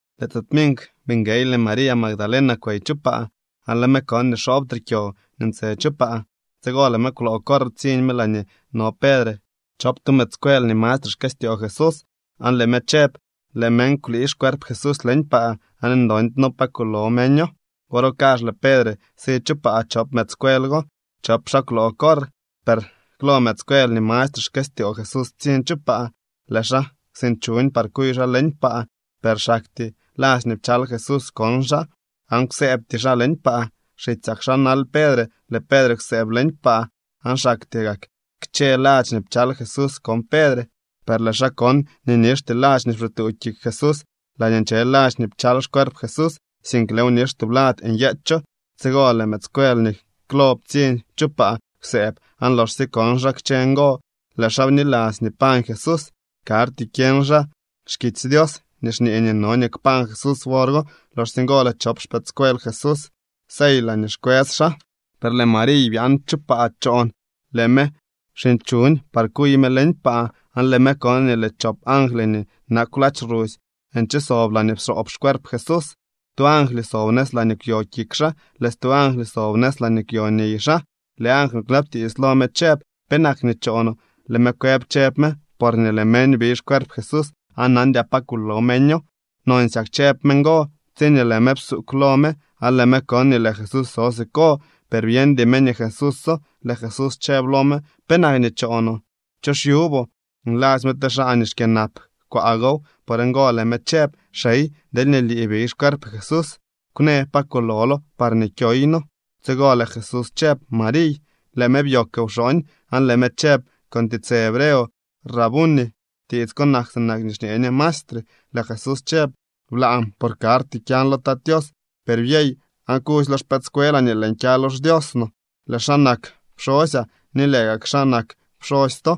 Lëë tse tminkw bii nguey lëë María Magdalena kwey chu paa, aan lëë me kon nii xoobtre kyo nii ntse chu paa. Tsigo lëë me kwloo corr ptsiñ me laañee no Pedre chop tu mëëdscuel nii mastre xkëstyoo Jesús, aan lëë me chëb: —Lëë meñ kwlii xcuerp Jesús leñ paa aan ndoondy pa kulo meño. Wor go kazh lëë Pedre si chu paa chop mëëdscuel go. Chop xaa kwloo corr, per klo mëëdscuel nii mastre xkëstyoo Jesús ptsiñ chu paa. Lëë xaa kwsinchuñ par kuy xaa leñ paa, per xaktyee ladx nii pchal Jesús kon xaa, aan kwsëëbty xaa leñ paa. Xitsyak xaa nal Pedre. Lëë Pedre kwsëëb leñ paa, aan xaktyee gak kchë ladx nii pchal Jesús kon Pedre. Per lëë xaa kon nii nixty ladx nii pxituu kik Jesús laañee nche ladx pchal xcuerp Jesús, sink lëëw nix tublad nyeecho. Tsigo lëë mëëdscuel nii klo ptsiñ chu paa kwsëëb, aan loxsye kon xaa kchë ngo, lëë xaa bniladzy nii pañ Jesús. Karty kyeñ xaa xkitsy Dios nii xñee nii no nii kpañ Jesús wor go. Loxsye ngo lëë chop xpëëdscuel Jesús sey laañee xkwës xaa. Per lëë Mariy byaan chu paa choon. Lëë me kwsinchuñ par kuy me leñ paa, aan lëë me kon nii lëë chop angly nii nakw ladx rusy nche sob laañee pxoob xcuerp Jesús. Tu angly sob nëz laañee kwyo kik Jesús, lëë stu angly sob nëz laa kwyo niy xaa. Lëë angly kwnabtiits lo me chëb: —¿Penak nii choonoo? Lëë me kwëb, chëb me: —Porñee lëë meñ biy xcuerp Jesús, aan nandyaa pa kulo meño. Nonsyak chëb me ngo, tsiñee lëë me psuugw lo me, aan lëë me kon nii lëë Jesús so siko, per byeñdy me nii Jesúso. Lëë Jesús chëb lo me: —¿Penak nii choonoo? ¿Cho xyuboo? Nladzy me te xaa nii xkyënap kwaa gow. Por ngo lëë me chëb: —Xey, deelñee lii biy xcuerp Jesús, kwnë pa kulolo parñee kyoyno. Tsigo lëë Jesús chëb: —¡Mariy! Lëë me byoogw wxooñ, aan lëë me chëb con tiitsë hebreo: —¡Rabuni! (Tiits ko nak sinak nii xñee ñe Maestre.) Lëë Jesús chëb: —Blaan, por karty kyan lo Tat Tios. Per byey aan kudzy lo xpëëdscuelaa nii lëën kya lo xDios no. Lëë xaa nak pxosyaa ni lëë gak kaa xaa nak pxosy to.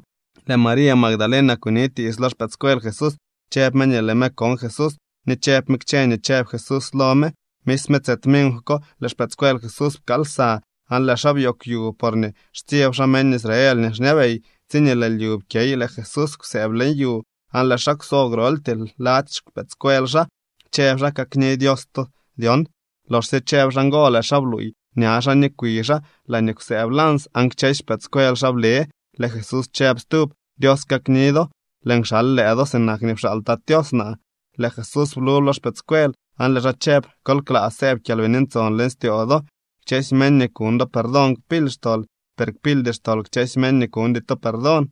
Lëë María Magdalena kunitiits lo xpëëdscuel Jesús. Chëb me nii lëë me kon Jesús ni chëb me kchë nii chëb Jesús lo me. Misme tse tminkw ko lëë xpëëdscuel Jesús pkaal lsa, aan lëë xaa byoogw yu, porñee xtsyeb xaa meñ Israel nii xñabey. Tsiñee lëë lyu pkyey lëë Jesús kwsëëb leñ yu aan lëë xaa kwso groltyee lady xpëëdscuel xaa, chëb xaa: —Kakni Dios to dyon. Loxsye chëb xaa ngo, lëë xaa bluuy ña xaa ni kwi xaa laañee kwsëëb lans, aan kchësy xpëëdscuel xaa ble. Lëë Jesús chëb stub: —Dios kakni do. Lëën kxal lëë do sinak nii pxaal Tat Tios naa. Lëë Jesús blub lo xpëëdscuel aan lëë xaa chëb: —Kol klaa sëëb Kyalbini Ntson leñ styoo do. Kchësy meñ nii kuñ do perdón kpily xtol, per kpildy xtol kchësy meñ nii kuñdy to perdón.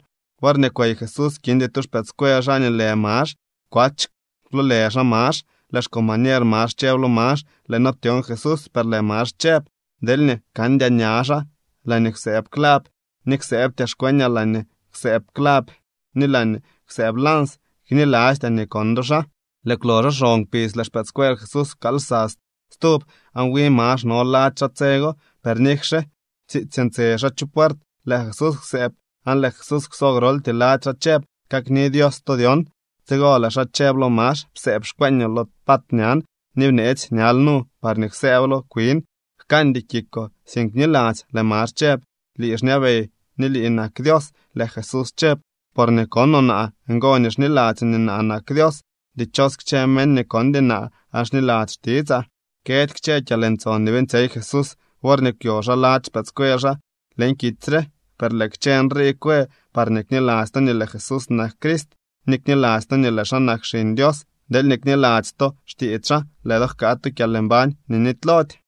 Worñee kwey Jesús, kindy tu xpëëdscuel xaa nii lë Max. (Kwach kwloolë xaa Max.) Lëë xcombañer Max chëb lo Max: —Lëë noo ptyon Jesús. Per lëë Max chëb: —Deelñee kandyaa ña xaa laañee kwsëëb clav, ni ksëëbtyaa xkweñaa laañee kwsëëb clav ni laañee kwsëëb lans, knilastyaa nii kon do xaa. Lëë kwloxo xon kpidz, lëë xpëëdscuel Jesús pkaal lsa stub, aan wi Max no lady xaa tse go. Per nikxe tsiitsy ntse xaa chu puert, lëë Jesús kwsëëb. Aan lëë Jesús kwso groltyee lady xaa chëb: —Kakni Dios to dyon. Tsigo lëë xaa chëb lo Max: —Psëëb xkweeñoo lo pat ñan, ni bneetsy ñal nu parñee ksëëblo kwin. Jkandy kikoo, sink bniladzy. Lëë Max chëb: —¡Lii xñabey ni lii nak Dios! Lëë Jesús chëb: —Porñee konoo naa, ngo nii xniladzyoo nii naa nak Dios. Dichos kchë meñ nii kondy naa aan xniladzy xtitsaa. Këdy kchë kyalntson nii beeñtsyey Jesús worñee kwyo xaa lady xpëëdscuel xaa leñ kitsy re. Per lëë kchë nrii kwë parñee kniladzy to nii lëë Jesús nak Crist, ni kniladzy to nii lëë xaa nak Xiñ Dios. Deelñee kniladzy to xtiits xaa, lëë do jkaa tu kyalmbañ nii nitylody.